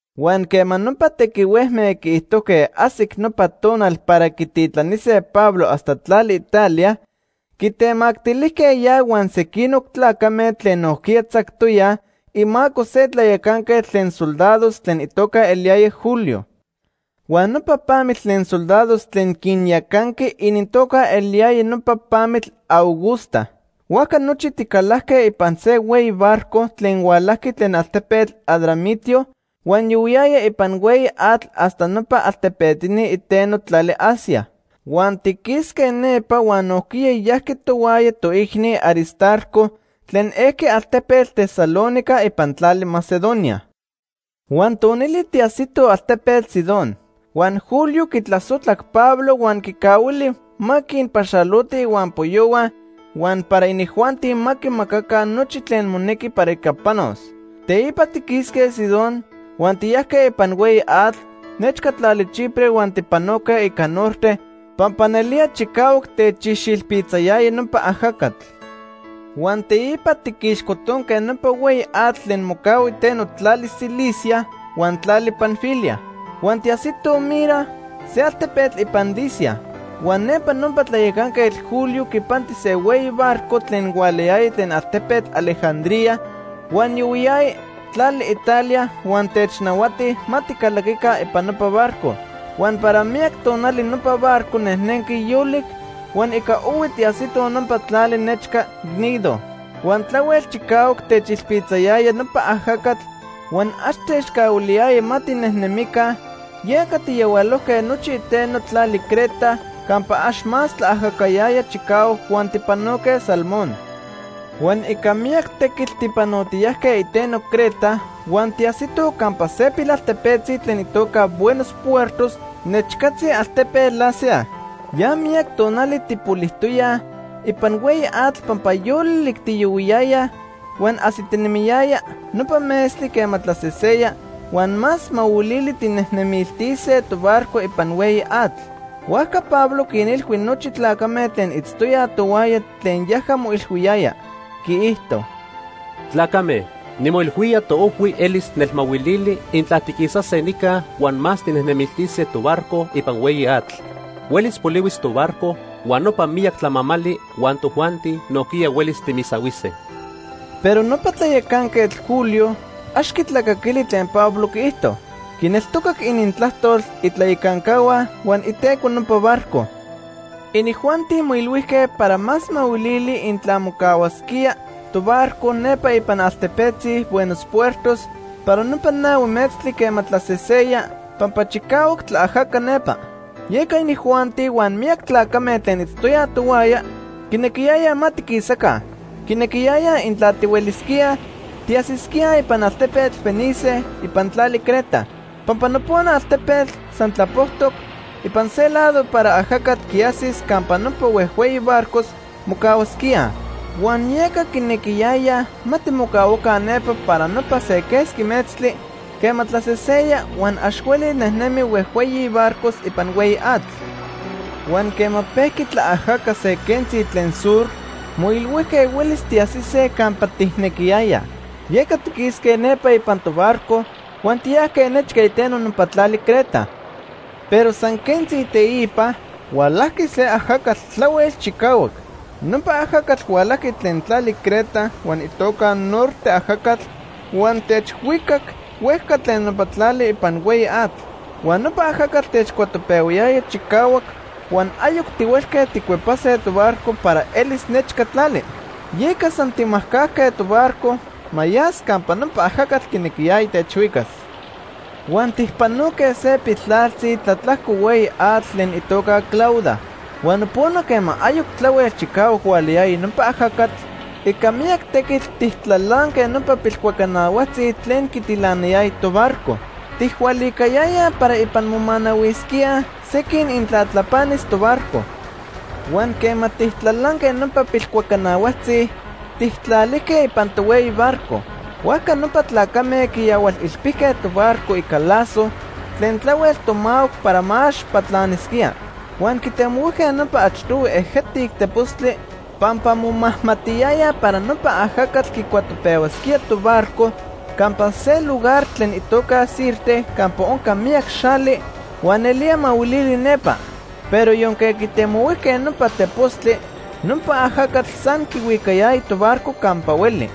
Huan quema nopa tequihuejme quiijtojque ajsic nopa tonal para quititlanise Pablo hasta tlali Italia, quitemactilijque ya huan sequinoc tlacame tlen nojquiya tzactoyaj imaco se tlayacanquetl tlen soldados tlen itoca eliyaya Julio. Huan nopa pamitl tlen soldados tlen quinyacanqui inintoca eliyaya nopa Pamitl Augusta. Huajca nochi ticalajque ipan se hueyi barco tlen hualajqui tlen altepetl Adramitio huan yohuiyaya ipan hueyi atl hasta nopa altepetini iteno tlali Asia. Huan tiquisque nepa huan nojquiya yajqui tohuaya toicni Aristarco tlen ejqui altepetl Tesalónica ipan tlali Macedonia. Huan tonili tiajsitoj altepetl Sidón. Huan Julio quitlasojtlac Pablo huan quicahuili ma quinpaxaloti ihuampoyohua huan para inijuanti ma quimacaca nochi tlen monequi para ica panos. Teipa tiquisque Sidón huan tiyajque ipan hueyi atl nechca tlali Chipre huan tipanoque ica norte pampa nelía chicahuac techixilpitzayaya nopa ajacatl. Huan teipa tiquixcotonque nopa hueyi atl tlen mocahua iteno tlali Cilicia huan tlali Panfilia. Huan tiajsitoj Mira, se altepetl ipan Licia. Huan nepa nopa tlayacanquetl Julio quipanti se hueyi barco tlen hualayaya tlen altepetl Alejandría huan yohuiyaya tlali Italia, huan technahuati ma ticalaquica ipan nopa barco. Huan para miyac tonali nopa barco nejnenqui yolic, huan ica ohui tiajsitoj nopa tlali nechca Gnido. Huan tlahuel chicahuac techilpitzayaya nopa ajacatl huan ax techcahuiliyaya ma tinejnemica, yeca tijyahualojque nochi iteno tlali Creta campa ax más tlaajacayaya chicahuac huan tijpanoque Salmón. Huan ica miyac tequitl tipanotiyajque iteno Creta huan tiajsitoj campa se pilaltepetzi tlen itoca Buenos Puertos nechcatzi altepetl Lasea. Ya miyac tonali tijpolijtoyaj ipan hueyi atl pampa yolic tiyohuiyayaj huan ajsitinemiyaya nopa metztli quema tlaseseya huan más mahuilili tijnejnemiltise tobarco ipan hueyi atl. Huajca Pablo quinilhui nochi tlacame tlen itztoyaj tohuaya tlen yaja moilhuiyaya. Quiijto: ―Tlacame, nimoilhuía toojhui elis nelmahuilili intla tiquisase nica huan más tijnejnemiltise tobarco ipan hueyi atl. Huelis polihuis tobarco, huan nopa miyac tlamamali huan tojuanti nojquiya huelis timisahuise. Pero nopa tlayacanquetl Julio ax quitlacaquili tlen Pablo quiijto. Quineltocac inintlajtol itlayacancahua huan iteco nopa barco. Inijuanti moilhuijque para más mahuilili intla mocahuasquía tobarco nepa ipan pilaltepetzi Buenos Puertos para nopa nahui metztli quema tlaseseya pampa chicahuac tlaajaca nepa. Yeca inijuanti huan miyac tlacame tlen itztoyaj tohuaya quinequiyayaj ma tiquisaca. Quinequiyayaj intla tihuelisquíaj, tiajsisquíaj ipan altepetl Fenice ipan tlali Creta. Pampa nopona altepetl san tlapojtoc ipan se lado para ajacatl quiajsis campa nopa huejhueyi barcos mocahuasquíaj. Huan yeca quinequiyayaj ma timocahuaca nepa para nopa se quesqui metztli quema tlaseseya huan ax hueli nejnemij huejhueyi barcos ipan hueyi atl. Huan quema pejqui tlaajaca se quentzi tlen sur, moilhuijque huelis tiajsise campa tijnequiyayaj. Yeca tiquisque nepa ipan tobarco huan tiyajque nechca iteno nopa tlali Creta. Pero san quentzi teipa, hualajqui se ajacatl tlahuel chicahuac. Nopa ajacatl hualajqui tlen tlali Creta huan itoca Norte ajacatl huan techhuicac huejca tlen nopa tlali ipan hueyi atl. Huan nopa ajacatl techcuatopehuayaya chicahuac, huan ayoc tihuelque tijcuepase tobarco para elis nechca tlali. Yeca san tijmajcajque tobarco ma yas campa nopa ajacatl quinequiyaya techhuicas. Huan tijpanoque se piltlaltzi tlatlajco hueyi atl tlen itoca Clauda. Huan nopona quema ayoc tlahuel chicahuac hualayaya nopa ajacatl; ica miyac tequitl, tijtlalanque nopa pilcuacanahuajtzi tlen quitilanayaya tobarco. Tijhualicayayaj para ipan momanahuisquíaj sequin intla tlapanis tobarco. Huan quema tijtlalanque nopa pilcuacanahuajtzi, tijtlalijque ipan tohueyi barco. Huajca nopa tlacame quiyahualilpijque tobarco ica lazo tlen tlahuel tomahuac para ma ax tlapanisquía. Huan quitemohuijque nopa achtohui ejetic tepostli, pampa momajmatiyayaj para nopa ajacatl quicuatopehuasquía tobarco campa se lugar tlen itoca Sirte campa onca miyac xali, huan nelía mahuilili nepa. Pero yonque quitemohuijque nopa tepostli, nopa ajacatl san quihuicayaya tobarco campa hueli.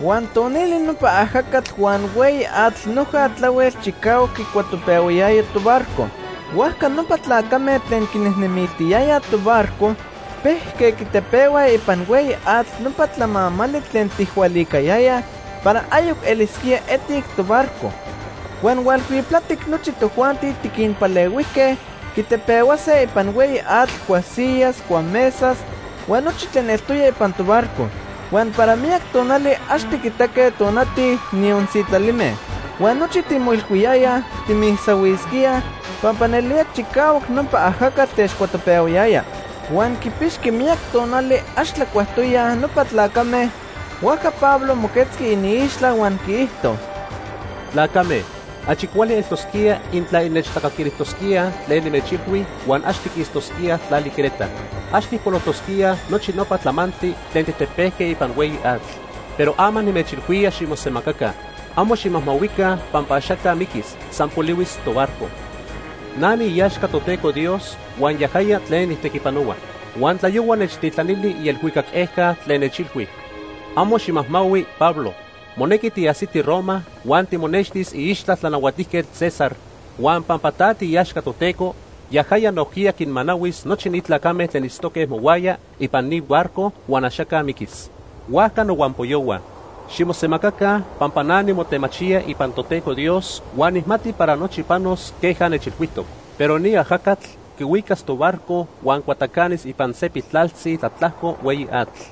Huan tonili nopa ajacatl huan hueyi atl noja tlahuel chicahuac quicuatopehuayaya tobarco. Huajca nopa tlacame tlen quinejnemiltiyayaj tobarco pejque quitepehuaj ipan hueyi atl nopa tlamamali tlen tijhualicayayaj para ayoc elisquía etic tobarco. Huan hualhuiptlatic nochi tojuanti tiquinpalehuijque quitepehuase ipan hueyi atl cuasiyas, cuamesas, huan nochi tlen eltoya ipan tobarco. Huan para miyac tonali ax tiquitaque tonati, niyon sitlalime. Huan nochi timoilhuiyayaj timisahuisquíaj pampa nelía chicahuac nopa ajacatl techcuatopehuayaya. Huan quipixqui miyac tonali ax tlacuajtoyaj nopa tlacame, huajca Pablo moquetzqui iniixtla huan quiijto: ―Tlacame, achi cuali eltosquía intla innechtlacaquilijtosquíaj tlen nimechilhui huan ax tiquistosquíaj tlali Creta. Ax tijpolojtosquíaj nochi nopa tlamantli tlen tijtepejque ipan hueyi atl. Pero ama nimechilhuía ximosemacaca, amo ximajmahuica pampa axaca miquis, san polihuis tobarco. Na niiaxca Toteco Dios huan yajaya tlen nijtequipanohua. Huan tlayohua nechtitlanili ielhuicac ejca tlen nechilhui: ‘Amo ximajmahui, Pablo, monequi tiajsiti Roma huan timonextis iixtla Tlanahuatijquetl César, huan pampa ta tiiaxca Toteco, yajaya nojquiya quinmanahuis nochi ni tlacame tlen itztoque mohuaya ipan ni barco huan axaca miquis.’ Huajca nohuampoyohua, ximosemacaca pampa na nimotemachía ipan Toteco Dios huan nijmati para nochi panos queja nechilhuijtoc. Pero ni ajacatl quihuicas tobarco huan cuatacanis ipan se piltlaltzi tlatlajco hueyi atl.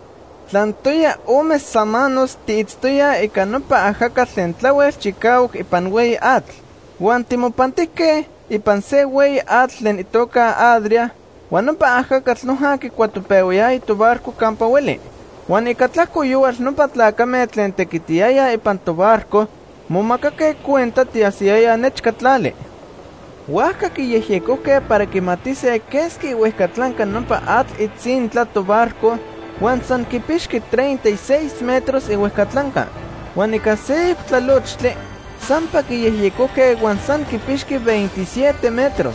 Tlantoya ome samanos tiitztoyaj ica nopa ajacatl tlen tlahuel chicahuac ipan hueyi atl. Huan timopantijque ipan se hueyi atl tlen itoca Adria huan nopa ajacatl noja quicuatopehuayaya tobarco campa hueli. Huan ica tlajco yohual nopa tlacame tlen tequitiyayaj ipan tobarco momacaque cuenta tiajsiyayaj nechca tlali. Huajca quiyejyecojque para quimatise quesqui ihuejcatlanca nopa atl itzintla tobarco, huan san quipixqui treinta y seis metros ihuejcatlanca. Huan ica seyoc tlalochtli, sampa quiyejyecojque huan san quipixqui veintisiete metros.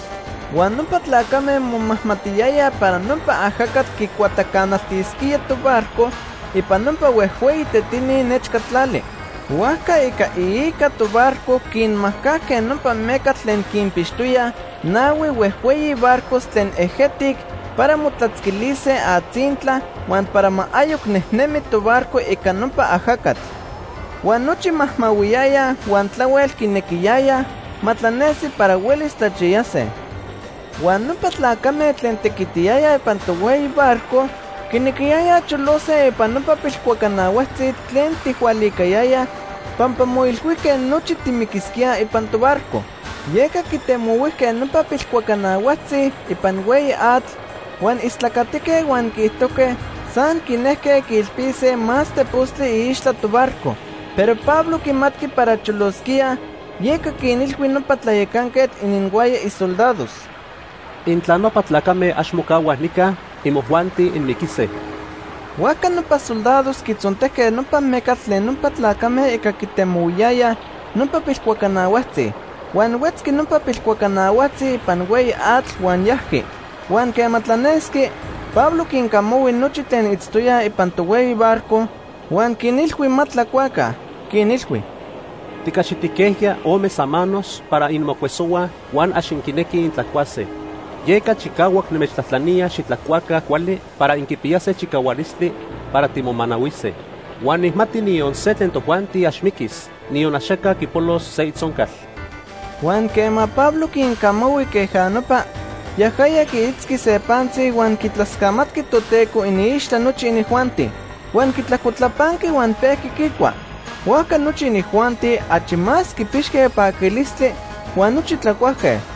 Huan nopa tlacame momajmatiyayaj para nopa ajacatl quicuatacanaltisquía tobarco ipan nopa huejhueyi tetini nechca tlali. Huajca ica iica tobarco quinmajcajque nopa mecatl tlen quinpixtoyaj nahui huejhueyi barcos tlen ejetic para motlatzquilise atzintla huan para ma ayoc nejnemi tobarco ica nopa ajacatl. Huan nochi majmahuiyayaj huan tlahuel quinequiyayaj ma tlanesi para huelis tlachiyase. Huan nopa tlacame tlen tequitiyayaj ipan tohueyi barco quinequiyayaj cholose ipan nopa pilcuacanahuajtzi tlen tijhualicayayaj pampa moilhuijque nochi timiquisquíaj ipan tobarco. Yeca quitemohuijque nopa pilcuacanahuajtzi ipan hueyi atl, huan istlacatique huan quiijtojque san quinejque quiilpise más tepostli iixtla tobarco. Pero Pablo quimatqui para cholosquíaj, yeca quinilhui nopa tlayacanquetl ininhuaya isoldados: ―Intla nopa tlacame ax mocahuaj nica, imojuanti inmiquise. Huajca nopa soldados quitzontejque nopa mecatl tlen nopa tlacame ica quitemohuiyayaj nopa pilcuacanahuajtzi. Huan huetzqui nopa pilcuacanahuajtzi ipan hueyi atl huan yajqui. Huan quema tlanesqui, Pablo quincamahui nochi tlen itztoyaj ipan tohueyi barco huan quinilhui ma tlacuaca. Quinilhui: ―Ticaxitijquejya ome samanos para inmocuesohuaj huan ax inquinequij intlacuase. Yeca chicahuac nimechtlajtlanía xitlacuaca cuali para inquipiyase chicahualistli para timomanahuise. Huan nijmati niyon se tlen tojuanti ax miquis, niyon axaca quipolos se itzoncal. Huan quema Pablo quincamahui queja nopa, yajaya quiitzqui se pantzi huan quitlascamatqui Toteco iniixtla nochi inijuanti. Huan quitlajcotlapanqui huan pejqui quicua. Huajca nochi inijuanti achi más quipixque paquilistli, huan nochi tlacuajque.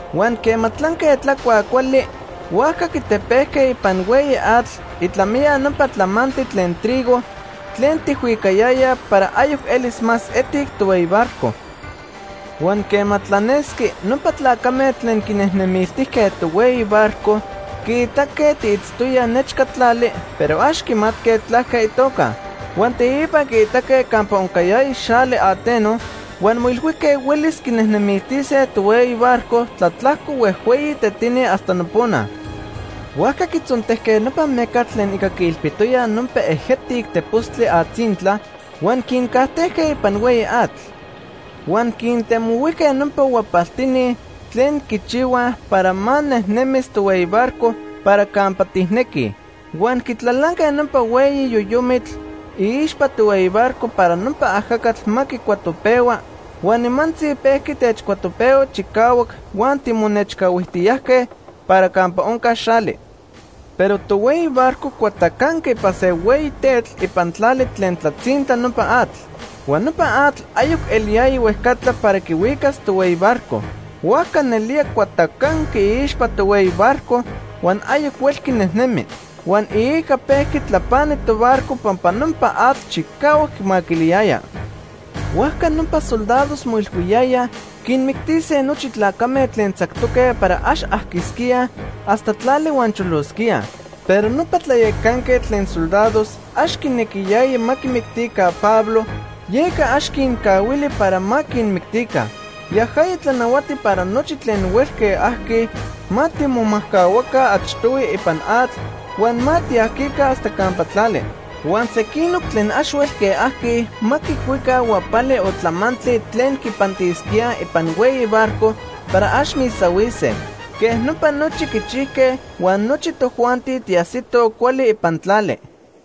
Huan quema tlanque tlacuaj cuali, huajca quitepejque ipan hueyi atl itlamiya nopa tlamamali tlen trigo tlen tijhuicayayaj para ayoc elis más etic tohueyi barco. Huan quema tlanesqui, nopa tlacame tlen quinejnemiltijque tohueyi barco quiitaque tiitztoyaj nechca tlali, pero ax quiixmatque tlaque itoca. Huan teipa quiitaque campa oncayaya xali ateno, huan moilhuijque huelis quinejnemiltise tohueyi barco tlatlajco huejhueyi tetini hasta nopona. Huajca quitzontejque nopa mecatl tlen ica quiilpitoyaj nopa ejetic tepostli atzintla, huan quincajtejque ipan hueyi atl. Huan quintemohuijque nopa huapaltini tlen quichihuaj para ma nejnemis tohueyi barco para campa tijnequij. Huan quitlalanque nopa hueyi yoyomitl iixpa tohueyi barco para nopa ajacatl ma quicuatopehua, huan nimantzi pejqui techcuatopehua chicahuac huan timonechcahuijtiyajque para campa onca xali. Pero tohueyi barco cuatacanqui ipan se hueyi tetl ipan tlali tlen tlatzintla nopa atl. Huan nopa atl ayoc eliyaya huejcatla para quihuicas tohueyi barco. Huajca nelía cuatacanqui iixpa tohueyi barco huan ayoc huelqui nejnemi. Huan iica pejqui tlapani tobarco pampa nopa atl chicahuac quimaquiliyaya. Huajca nopa soldados moilhuiyayaj quinmictise nochi tlacame tlen tzactoque para ax ajquisquíaj hasta tlali huan cholosquíaj. Pero nopa tlayacanquetl tlen soldados ax quinequiyaya ma quimictica Pablo, yeca ax quincahuili para ma quinmictica. Yajaya tlanahuati para nochi tlen huelque ajquij ma timomajcahuaca achtohui ipan atl huan ma tiajquica hasta campa tlali. Huan sequinoc tlen ax huelque ajquij ma quicuica huapali o tlamantli tlen quipantisquía ipan hueyi barco para ax misahuise. Quej nopa nochi quichijque huan nochi tojuanti tiajsitoj cuali ipan tlali.